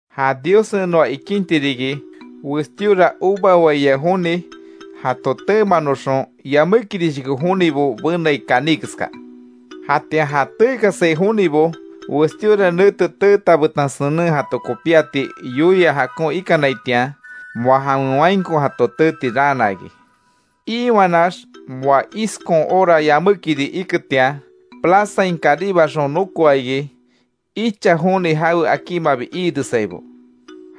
Ja Diossen noa ikinti riki, westíora uva waia joni jato teemanoxon yamékirishoko jonibo benai kaní keska. Jatian ja teekasai jonibo westíora nete teeta betan senen jato kopíati yoia jakon ikanaitian, moa jawen wainko jato teeti raana iki. Iiwanax, moa iskon hora yamékiri iketian, plazain karibaxon nokoa iki, icha joni jawe akímabi iiresaibo.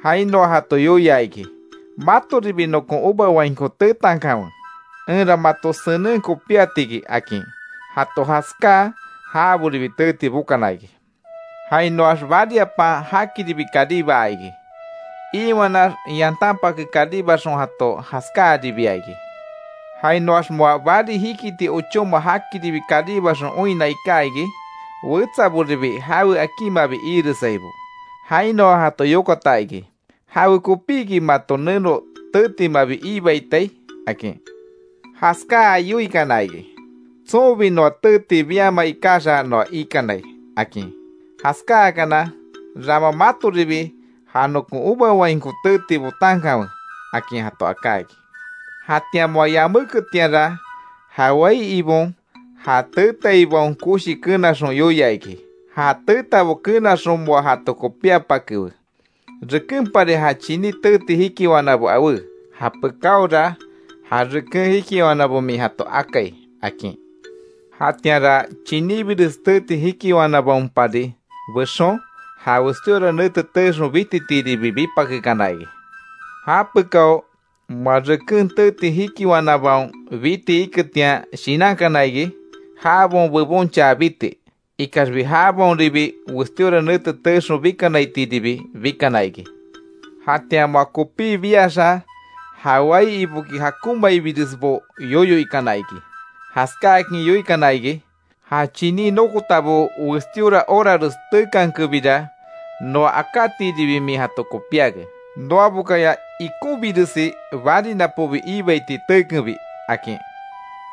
Jainoa jato yoia iki: ‘Matoribi nokon uva wainko teetankanwe, enra mato senen kopíatiki’, akin. Jato jaskáa, jaboribi teeti bokana iki. Jainoax bariapan, jakiribi karibaa iki. Iiwanax yantanpake karibaxon jato jaskáaribia iki. Jainoax moa bari jikiti ochóma jakiribi karibaxon oinna iká iki, wetsaboribi jawe akímabi iiresaibo, jainoa jato yokata iki: ‘¿Jawekopíki mato neno teetimabi iibaitai?’ akin. Jaskáa yoikana iki: ‘Tsonbi noa teeti biama ikaxa noa ikanai’, akin. Jaskáakana: ‘Rama matoribi ja nokon uva wainko teeti botankanwe’, akin jato aká iki. Jatian moa yaméketianra ja wai ibon, ja teetaibaon koshi kenaxon yoia iki: ‘Ja teetabo kenaxon moa jato kopíapakewe, rekenpari ja chiní teeti jikiwanabo awé, japekáora ja reken jikiwanabo min jato akai’, akin. Jatianra chiníbires teeti jikiwanabaonpari bexon, ja westíora nete teexon bititiiribi bipakekana iki. Japekao, moa reken teeti jikiwanabaon biti iketian shinankana iki, jabaon bebonchaa biti. Ikaxbi jabaonribi, westíora nete teexon bikanaitiiribi bikana iki. Jatian moa kopí biaxa, ja wai iboki jakonmaibiresbo yoyo ikana iki. Jaskákin yoikana iki: ‘Ja chiní nokotabo westíora horares teekankenbira, noa akátiiribi min jato kopíake, noabokaya ikonbiresi bari napobi iibaiti teekenbi’, akin.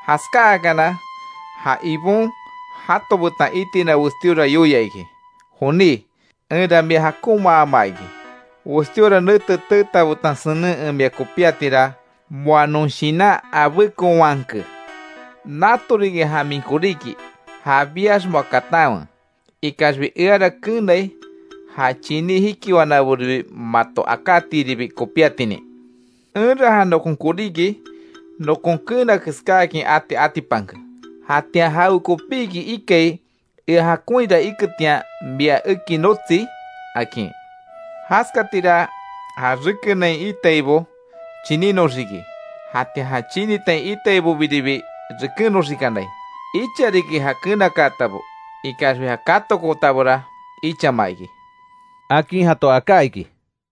Jaskáakana, ja ibon, jato betan itina westíora yoia iki: ‘Joní, enra mia jakonmaama iki. Westíora nete teeta betan senen en mia kopíatira moa non shinan abékonwanke. Natoriki ja min koríki, ja biax moa katanwe. Ikaxbi eara keenai ja chiní jikiwanaboribi mato akátiiribi kopíatinin. Enra ja nokon koríki, nokon keena keskáakin ati atipanke. Jatian ¿Jawekopíki ikai ea jakonhira iketian mia eki notsi?’ akin. Jaskatira, ja rekenain iitaibo chinínoxiki, jatian ja chinitain iitaibobiribi rekennoxikanai. Icha riki ja kenakaatabo, ikaxbi ja katokootabora ichama iki —akin jato aká iki.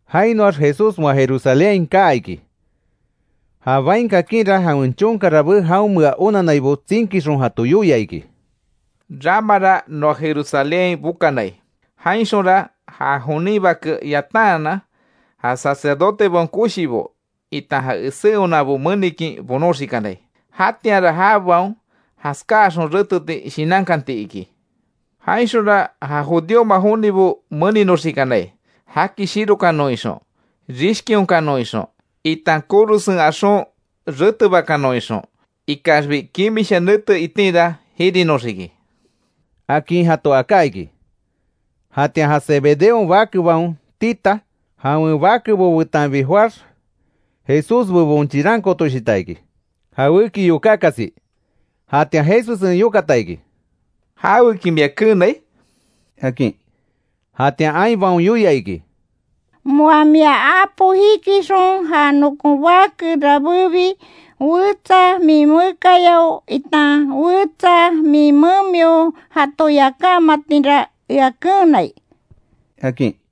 Jainoax Jesús moa jerusalénhain, kaa iki. Ja bain kakinra jawen chonka rabé jaonmea onannaibo tsinkixon jato yoia iki: —Ramara noa jerusalénhain bokanai, jainxonra ja jonin Bake yataanan ja sacerdotebaon koshibo itan ja esé onanbo menikin bonoxikanai. Jatianra jabaon jaskáaxon reteti shinankanti iki. Jainxonra ja judíoma jonibo meninoxikanai jaki shirokanon ixon, rishkionkanon ixon, itan korosen axon retebakanon ixon. Ikaxbi kimisha nete itinra jirinoxiki —akin jato aká iki. Jatian ja Zebedeon bakebaon tita, jawen bakebo betanbi joáx Jesús bebon chirankootoshita iki, jawéki yokákasi. Jatian Jesussen yokata iki: —¿Jaweki mia keenai? —akin. Jatian ainbaon yoia iki: —Moa mia apo jikixon ja nokon bake rabébi, wetsa min mekayao, itan wetsa min memio jato yakámatinra ea keenai —akin.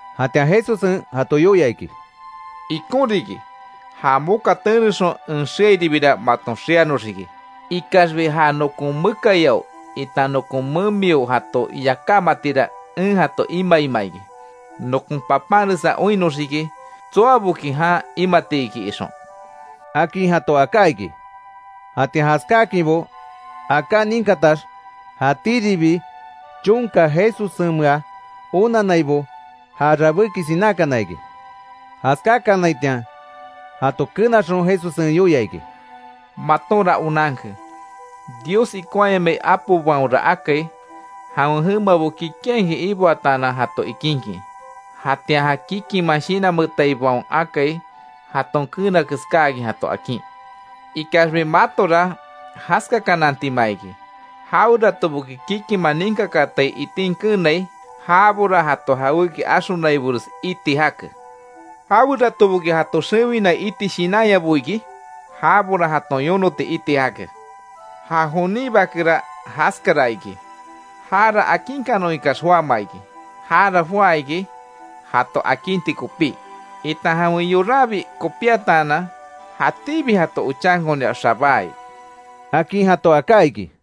Jatian Jesussen jato yoia iki: —Ikon riki, ja moka tenexon en xeairibira maton xeanoxiki. Ikaxbi ja nokon mekayao itan nokon memio jato yakámatira, en jato imaima iki. Nokon papanresa oinnoxiki tsoaboki jan imatiki ixon —akin jato aká iki. Jatian jaskáakinbo aká ninkatax, jatíribi chonka Jesussenmea onannaibo, ja rabéki sinákana iki. Jaskákanaitian jato kenaxon Jesussen yoia iki: —Matonra onanke, Dios ikonhayamai apobaonra akai jawen jemabo kikinhakin iboataanan jato ikinkin. Jatian ja kikinman shinanmeetaibaon akai jaton keena keskáakin jato akin. Ikaxbi matora jaskakanantima iki. Jaweratoboki kikinman ninkakaatai itin keenai, jabora jato jawéki axonaibores iti jake. Jaweratoboki jato xewina iti shinanyabo iki, jabora jaton yonoti iti jake. Ja jonin Bakera jaskara iki. Jara akinkanon ikax joáma iki. Jara joá iki jato akinti kopí, itan jawen yoranbi kopíataanan jatíbi jato ochankonia xabáai —akin jato aká iki.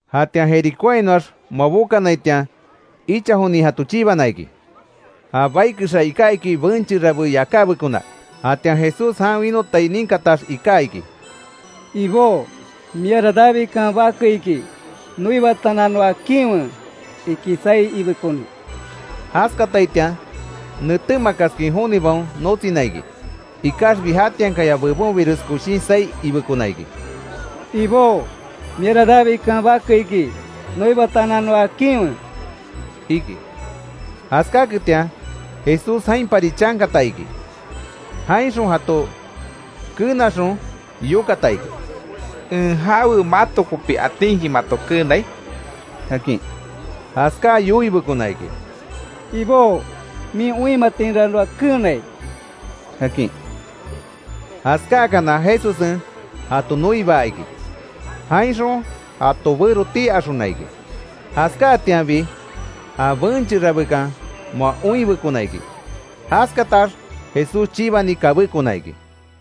Jatian Jericóainoax moa bokanaitian, icha jonin jato chibana iki. Ja bai kexa iká iki benche rabé yakábekona. Jatian Jesús jan winotai ninkatax, iká iki: —Ibó, miara Davidkan bake iki. Noibataanan noa akinwe —iki saí ibekoni. Jaskataitian, netémakaskin jonibaon notsina iki. Ikaxbi jatiankaya bebonbires koshin saí ibekona iki: —Ibó, miara Davidkan bake iki. Noibataanan noa akinwe —iki. Jaskaketian Jesús jainpari chankata iki. Jainxon jato kenaxon yokata iki: —¿En jawe mato kopi atinki mato keenai? —akin. Jaskáa yoibekona iki: —Ibó, min oinmatinra noa keenai —akin. Jaskáakana Jesussen jato noibaa iki. Jainxon jato bero tii axona iki. Jaskáatianbi ja benche rabékan moa oinbekona iki. Jaskatax Jesús chibani kabékona iki.